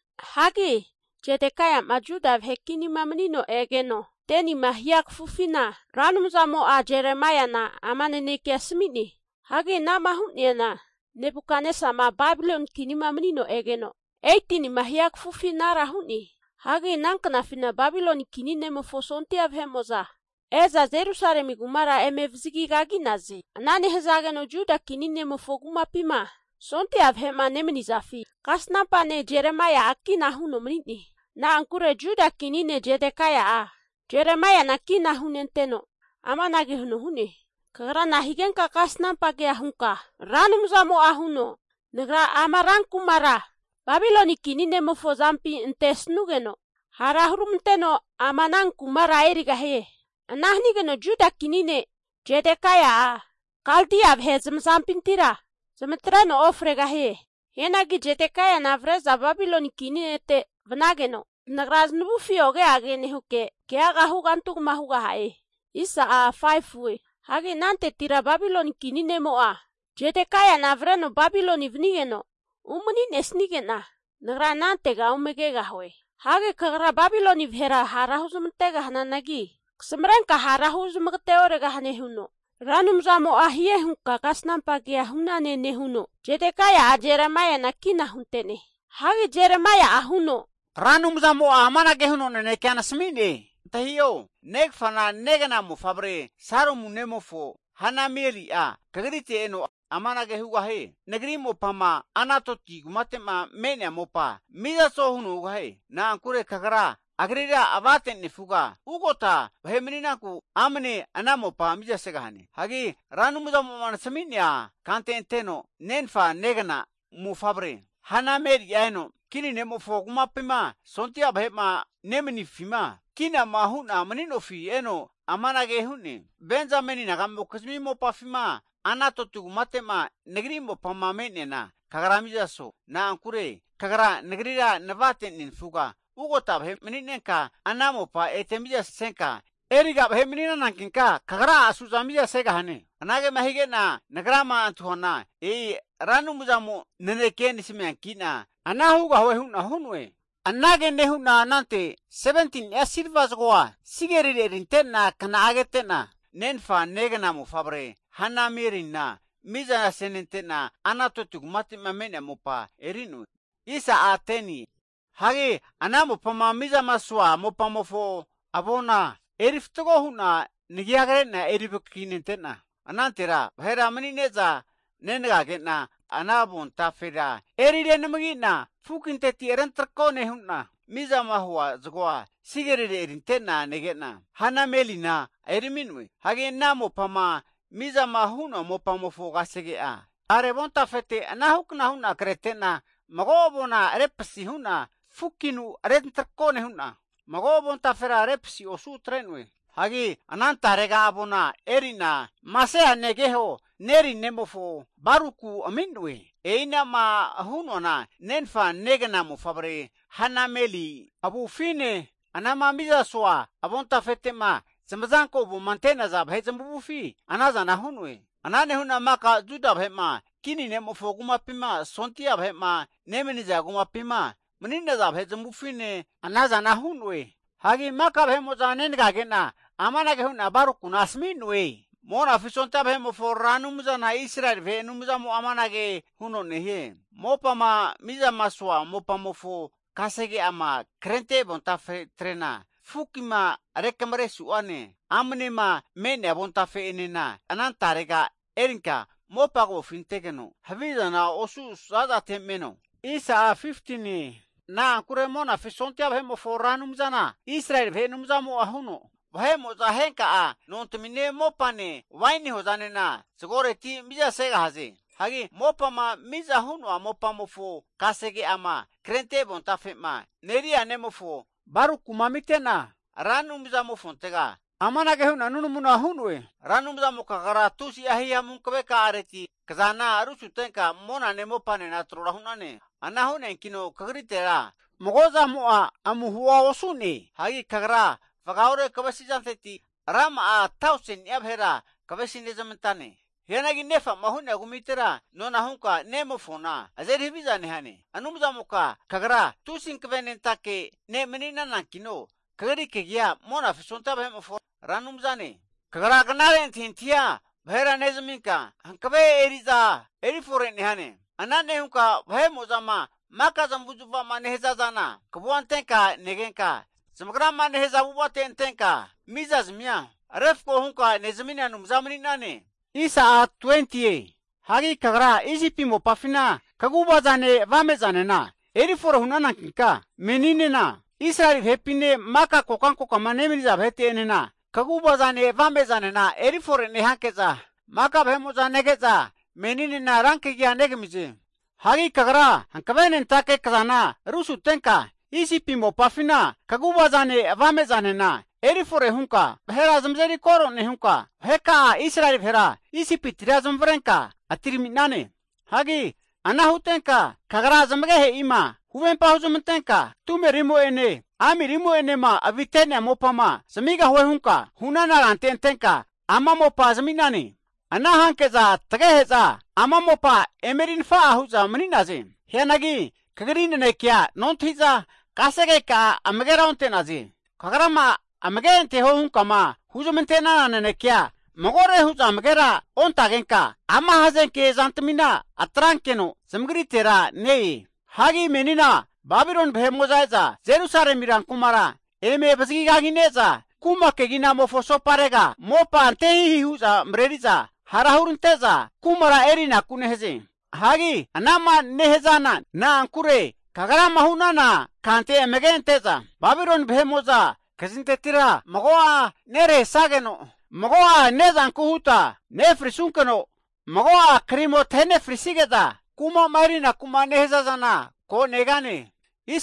Hagi Zedekaia'ma Juda vahe kinima manino egeno 10nima hia kafufina, Ra Anumzamo'a Jeremaia'na ama nanekea asami'ne. Hagi ana'ma hu'neana Nebukatnesama Babiloni kinima manino egeno 18nima hia kafufi anara hu'ne. Hagi ana knafina Babiloni kini ne'mofo sondia vahe'mo'za e'za Jerusalemi kumara eme vazagi kagi'naze. Ana nehazageno Juda kini ne'mofo kumapima sondia vahe'ma nemanizafi kasnampa ne' Jeremaia'a kina huno mani'ne. Na'ankure Juda kini ne' Zedekaia'a, Jeremaiana kina hunenteno amanage huno hu'ne, kagra nahigenka kasnampa kea hunka, Ra Anumzamo'a huno, Nagra ama rankumara Babiloni kini ne'mofo azampi antesanugeno hara huramanteno ama anankumara erigahie. Ana hanigeno Juda kini ne' Zedekaia'a Kaldia vahe zamazampintira zamatreno ofregahie. Hianagi Zedekaiana avre'za Babiloni kini nete vanageno, zanagra zanavufi oge age nehuke keaga hugantigma hugaha'e. Hagi anantetira Babiloni kini nemo'a Zedekaiana avreno Babiloni vanigeno umani nesanige'na, Nagra anantega ome kegahue. Hagi kagra Babiloni vahera hara huzamante'gahananagi kasamarenka hara huzamagate oregahane huno, Ra Anumzamo'a hie hunka kasnampa kea hu'nane nehuno, Zedekaia'a Jeremaiana kina hunte'ne. Hagi Jeremaia'a huno, Ra Anumzamo'a amanage huno nanekea nasami'ne. Antahio! Negafana negna mofavre Salumu nemofo Hanameli'a kagrite eno amanage hugahie. Nagri mopama Anatoti kumate'ma me'nea mopa mizaso huno hugahie. Na'ankure kagra agrira avate nefuga ugota vahe mani'nanku amane ana mopa mizasegahane. Hagi Ra Anumzamo'ma nasami'nea kante anteno, nenfa negna mofavre Hanameli'a eno, kini ne'mofo kumapima sondia vahe'ma nemanifima kinama hu'na mani'nofi eno amanage hu'ne. Benzameni nagamokizmi mopafima Anatoti kumate'ma Nagri mopama me'neana kagra mizaso. Na'ankure kagra nagrira navate nenafuga ugota vahe mani'nenka ana mopa ete mizasenka eriga vahe mani'nanankinka, kagra'a suza mizasegahane. Anagema hige'na nagrama antahuana, e'i Ra Anumzamo naneke nasamianki'na ana hugahue hu'na hu'noe. Anage nehu'na anante 17ni'a silva zagoa sigerire erinte'na kna'a kete'na, nenfa negna mofavre Hanamelina mizana senente'na, Anatoti kumate'ma me'nea mopa eri'noe. Hagi ana mopama mizamasoa mopamofo avona eri fatgo hu'na nagia krena eri vakaki nente'na, anantera vahera manine'za negage'na ana avontafera eri renamagi'na fukinteti rentrako nehu'na, mizama hua zagoa sigerire erinte'na nege'na Hanamelina erimi'noe. Hagi ana mopama mizama hua mopamofo kasege'a tare avontafete anahukna hu'na krete'na mago avona repasi hu'na fukinu rentarako nehu'na, mago avontafera repasi osu atre'noe. Hagi anantarega avona eri'na Maseia negeho Neri nemofo Baruku ami'noe. E'ina'ma hu'noana nenfa negna mofavre Hanameli avufine, anama mizamasoa avontafete'ma zamazanko avoma ante'naza vahe zamavufi anazana hu'noe. Ana nehu'na maka Juda vahe'ma, kini ne'mofo kumapima sondia vahe'ma nemaniza kumapima mani'naza vahe zamavufine ana zana hu'no'e. Hagi maka vahe'mo'za negage'na amanage hu'na Barukuna asami'noe. Monafi sondia Vahe'mofo Ra Anumzana Israeli vahe Anumzamo'a amanage huno nehie, mopama mizamasoa mopamofo kasege'ama krente avontafetrena fukima rekamare su'ane amnema me'nea avontafe'enena anantarega erinka mopa kavofi antegeno havizana osu zazate meno. Na'ankure Monafi sondia Vahe'mofo Ra Anumzana Israeli vahe Anumzamo'a huno, vahe'mo'za henka'a nontamine mopane waini hozanena zagoreti mizasegahaze. Hagi mopama miza hu'noa mopamofo kasege'ama krente avontafe'ma Neria nemofo Barukuma amite'na, Ra Anumzamofontega amanage hu'na nunamuna hu'noe. Ra Anumzamoka kagra tusi'a hihamu hankave ka'areti kazana rusutenka monane mopanena tro hu'nane. Ana hu'neankino kagritera mago zamo'a amuhoa osu'ne. Hagi Kagra vagaore kavesizanteti, rama'a tauseni'a vahera kavesi nezamantane. Hianagi nefa'ma hu'nea kumitera nona hunka nemofona azeri haviza nehane. Anumzamoka kagra tusi hankavenentake ne' mani'nanankino, kagri kagi'a Monafi sondia vahe'mofo Ra Anumzane. Kagra knare antahintahia vahera nezaminka, hankave eri'za erifore nehane. Ana nehunka vahe'mo'zama maka zamavu'zmavama nehazana kavua antenka negenka, zamagrama nehaza avu'avate antenka mizazmia refko hunka nezamina Anumza mani'nane. Hagi kagra Isipi mopafina kaguvazane avame'zanena erifore hu'nanankinka, meninena Israeli vahepine maka kokankokama nemaniza vahete'enena kaguva zane avame zanena erifore nehanke'za maka vahe'mo'za nege'za meninena rankagia negamize. Hagi Kagra hankavenentake kazana rusutenka, Isipi mopafina kaguva zane avame zanena eri fore hunka vahera zamazeri koro nehunka, vaheka'a Israeli vahera Isipitira zamavarenka atirami'nane. Hagi ana hutenka kagra zamagehe'ima huvempa huzmantenka, tumerimo'ene amirimo'enema avite'nea mopama zamigahue hunka hu'nana kante antenka ama mopa zami'nane. Ana hanke'za tagehe'za ama mopa eme eri'nafa'a hu'za mani'naze. Hianagi kagri nanekea nontahi'za kasegeka'a amagera onte'naze. Kagrama amage anteho hunkama huzamante'nana nanekea magore hu'za amagera ontagenka ama hazenke zantamina atrankeno zamagritera ne-e. Hagi menina Babiloni vahe'mo'za e'za Jerusalemi rankumara eme vazagi kagine'za, kuma keginamofo asoparega mopa antehihi hu'za mareri'za hara hurante'za kumara erinaku nehaze. Hagi anama nehazana, na'ankure Kagrama hunana kante amage ante'za Babiloni vahe'mo'za kazintetira mago'a nerahesageno, mago'a ne'zanku huta nefrisunkeno, mago'a krimo tahe nefrisige'za kuma'ma erinaku'ma nehaza zana ko negane.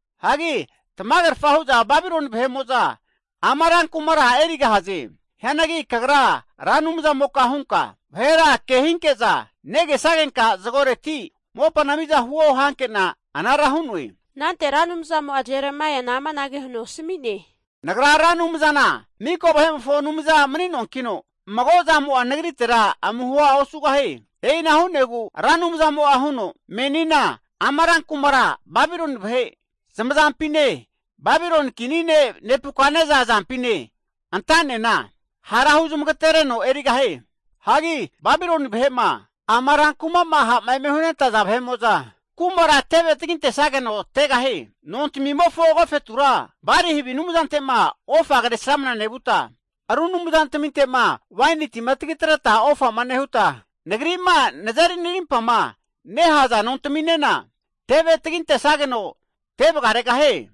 Hagi tamagerfa hu'za Babiloni vahe'mo'za ama rankumara erigahaze. Hianagi kagra Ra Anumzamoka hunka, vahera kehinke'za negesagenka zagoreti mopa mizana huo hanke'na anara hu'noe. Anante Ra Anumzamo'a Jeremaiana amanage huno asami'ne. Nagra Ra Anumzana miko vahe'mofo Anumza mani'noankino, mago zamo'a nagritera amuhoa osugahie. E'ina hu'negu Ra Anumzamo'a huno, menina ama rankumara Babiloni vahe zamazampine, Babiloni kini ne' Nebukatnesa azampine anta'nena hara huzmagatereno erigahie. Hagi Babiloni vahe'ma ama rankuma'ma ha'ma eme hunentaza vahe'mo'za, kumara teve tagintesageno tegahie. Nontamimofo agofetura Bali havi anumzante'ma ofa kresramna nevuta, ru anumzantaminte'ma waini tima tagitreta ofama nehuta, Nagri'ma nazeri narimpama nehaza nontaminena teve taginte'sageno te vagaregahie.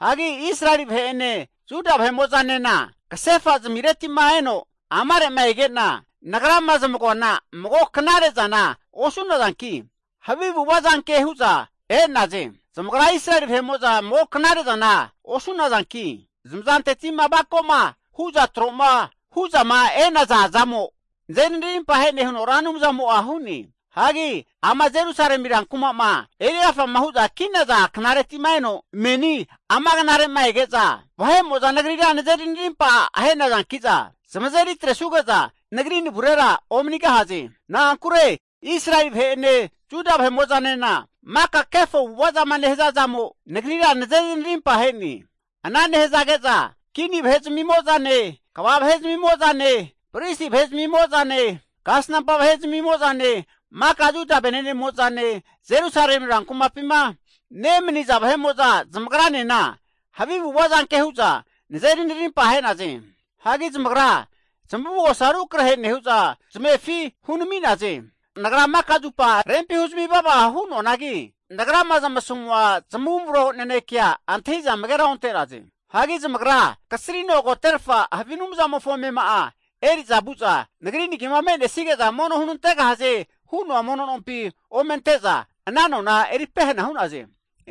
Hagi Israeli vahe'ene Juda vahemo'zanena, kasefa zamireti'ma eno amare'ma ege'na, Nagrama zamagoana mago knare zana osu'nazanki havi avu'ava zanke hu'za e'naze. Zamagra Israeli vahe'mo'za mago knare zana osu'nazanki, zamazanteti'ma avako'ma hu'za tro'ma hu'zama e'naza zamo nazeri narimpahe'ne huno Ra Anumzamo'a hu'ne. Hagi ama Jerusalemi rankuma'ma erigafama hu'za ki'naza knareti'ma eno meni ama knare'ma ege'za, vahe'mo'za nagrira nazeri narimpa ahe'nazankina, zamazeri atresuge'za Nagri navurera omanigahaze. Na'ankure Israeli vahe'ene Juda vahemo'zanena maka kefo avu'ava zama nehaza zamo Nagrira nazeri narimpa ahe'ne. Ana nehazage'za kini vahe zamimo'zane, kva vahe zamimo'zane, pristi vahe zamimo'zane, kasnampa vahe zamimo'zane, maka Juda venenemo'zane, Jerusalemi rankumapima nemaniza vahe'mo'za zamagranena havi avu'ava zanke hu'za nazeri narimpa ahe'naze. Hagi zamagra zamavugosa rukrahe nehu'za, zamefi hunami'naze. Nagra maka zupa rempi huzmi vava hu'noanagi, Nagrama zamasamua zamavumro nanekea antahi'za amagera onte'naze. Hagi zamagra kasrino agoterfa havi anumzamofo amema'a eri'za vu'za, Nagri nagima me'nesige'za mono hunantegahaze hu'noa mono nompi omente'za, ana nona eri pehena hu'naze.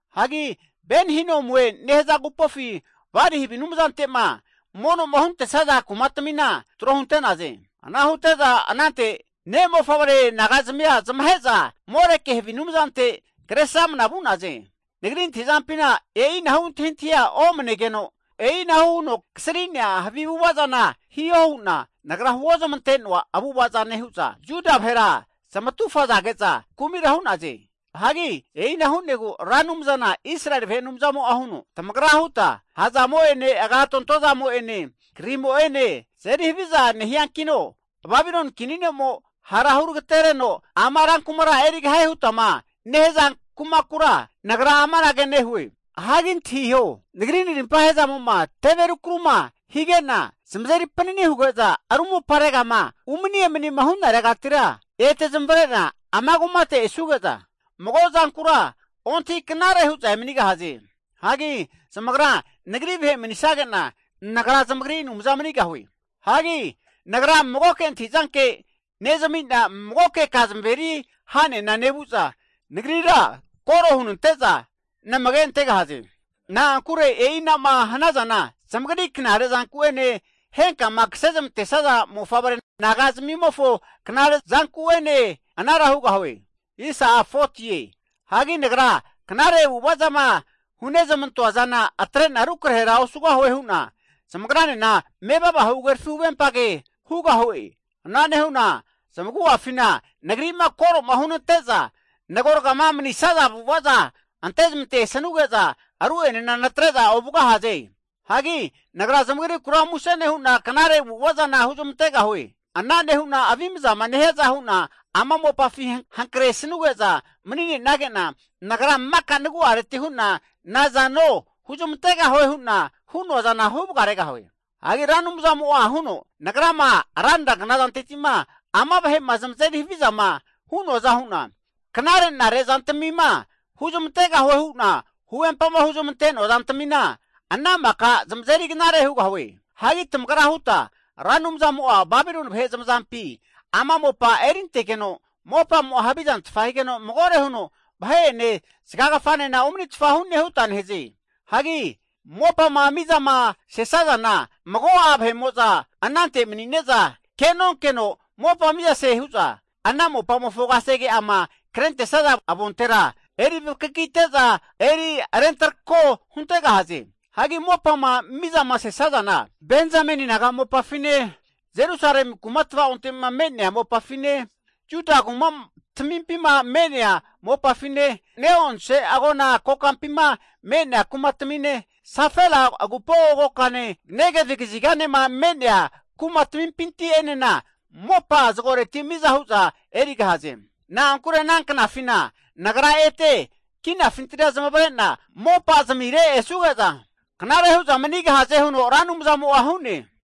Hagi Ben-Hinomue nehaza agupofi Bali havi anumzante'ma mono'ma huntesaza kumatamina tro hunte'naze. Ana hute'za anante ne' mofavre naga'zamia zamahe'za Moreki havi anumzante Kresramana vu'naze. Nagri antahi'zampina e'inahu antahintahia omanegeno, e'ina huno kasri'nea havi avu'ava zana hiho hu'na Nagra huozamante'noa avu'avaza nehu'za, Juda vahera zamatu fazage'za kumira hu'naze. Hagi e'ina hu'negu Ra Anumzana Israeli vahe Anumzamo'a huno, Tamagra huta ha'zamo'ene agatonto zamo'ene krimo'ene tazeri haviza nehiankino, Babiloni kini ne'mo hara huragatereno ama rankumara erigahie hutama nehaza kumakura Nagra amanage nehue. Hagi antahiho! Nagri narimpahe zamo'ma teve rukaru'ma hige'na, zamazeri panini huge'za ru moparegama umani emanima hu'naregatira, ete zamavare'na ama kumate esuge'za, mago zankura ontahi knare hu'za emanigahaze. Hagi zamagra Nagri vahe manisage'na, Nagra zamagri Anumza manigahue. Hagi Nagra magoke antahizanke nezami'na, magoke ka zamaveri ha'nena nevu'za nagrira koro hunante'za namage antegahaze. Na'ankure e'i ana'ma hanazana zamagri knare zanku'ene henkama kase zamantesaza mofavre naga'zamimofo knare zanku'ene anara hugahaze. Hagi Nagra knare avu'ava zama hunezmantoa zana atre'na rukrahera osugahue hu'na, zamagranena mevava huhagerafi huvempa kea hugahue. Ana nehu'na zamagu'afina Nagri'ma koro'ma hunante'za nagorgama manisaza avu'avaza ante zamante sanuge'za, ru'enena natre'za ovugahaze. Hagi Nagra zamagrikura muse nehu'na knare avu'ava zana huzmantegahue. Ana nehu'na avimzama nehiaza hu'nama ama mopafi hankre sanuge'za mani'nenage'na, Nagra maka nagu'areti hu'na nazano huzmantegahue hu'na hu'noa zana huvagaregahue. Hagi Ra Anumzamo'a huno, Nagrama ranra knazanteti'ma ama vahe'ma zamazeri havizama hu'noaza hu'na, knare'nare zantamima huzmantegahue hu'na huvempama huzmante'noa zantamina ana maka zamazeri knare hugahue. Hagi tamagra huta, Ra Anumzamo'a Babiloni vahe zamazampi ama mopa erintegeno, mopamo'a havizantfa higeno magore huno vahe'ene zagagafanena omanitfa hu'ne huta nehaze. Hagi mopama mizasesazana, mago'a vahe'mo'za anante manine'za ke'nonkeno mopa mizase hu'za ana mopamofo kasege'ama krentesaza avontera zamagi'a eri vakakite'za ana avona eri rentarako huntegahaze. Hagi mopama mizama sesazana, Benzameni naga mopafine, Jerusalemi kuma tvaonte'ma me'nea mopafine, Juda kuma tamimpima me'nea mopafine, ne'onse agona kokampima me'nea kumatamine, Sefela agupo kokane, Negevi kaziganema me'nea kuma tamimpinti'enena, mopa zagoreti miza hu'za erigahaze. Na'ankure ana knafina Nagra ete kinafintira zamavarena mopa zamire esuge'za knare hu'za manigahaze huno Ra Anumzamo'a hu'ne.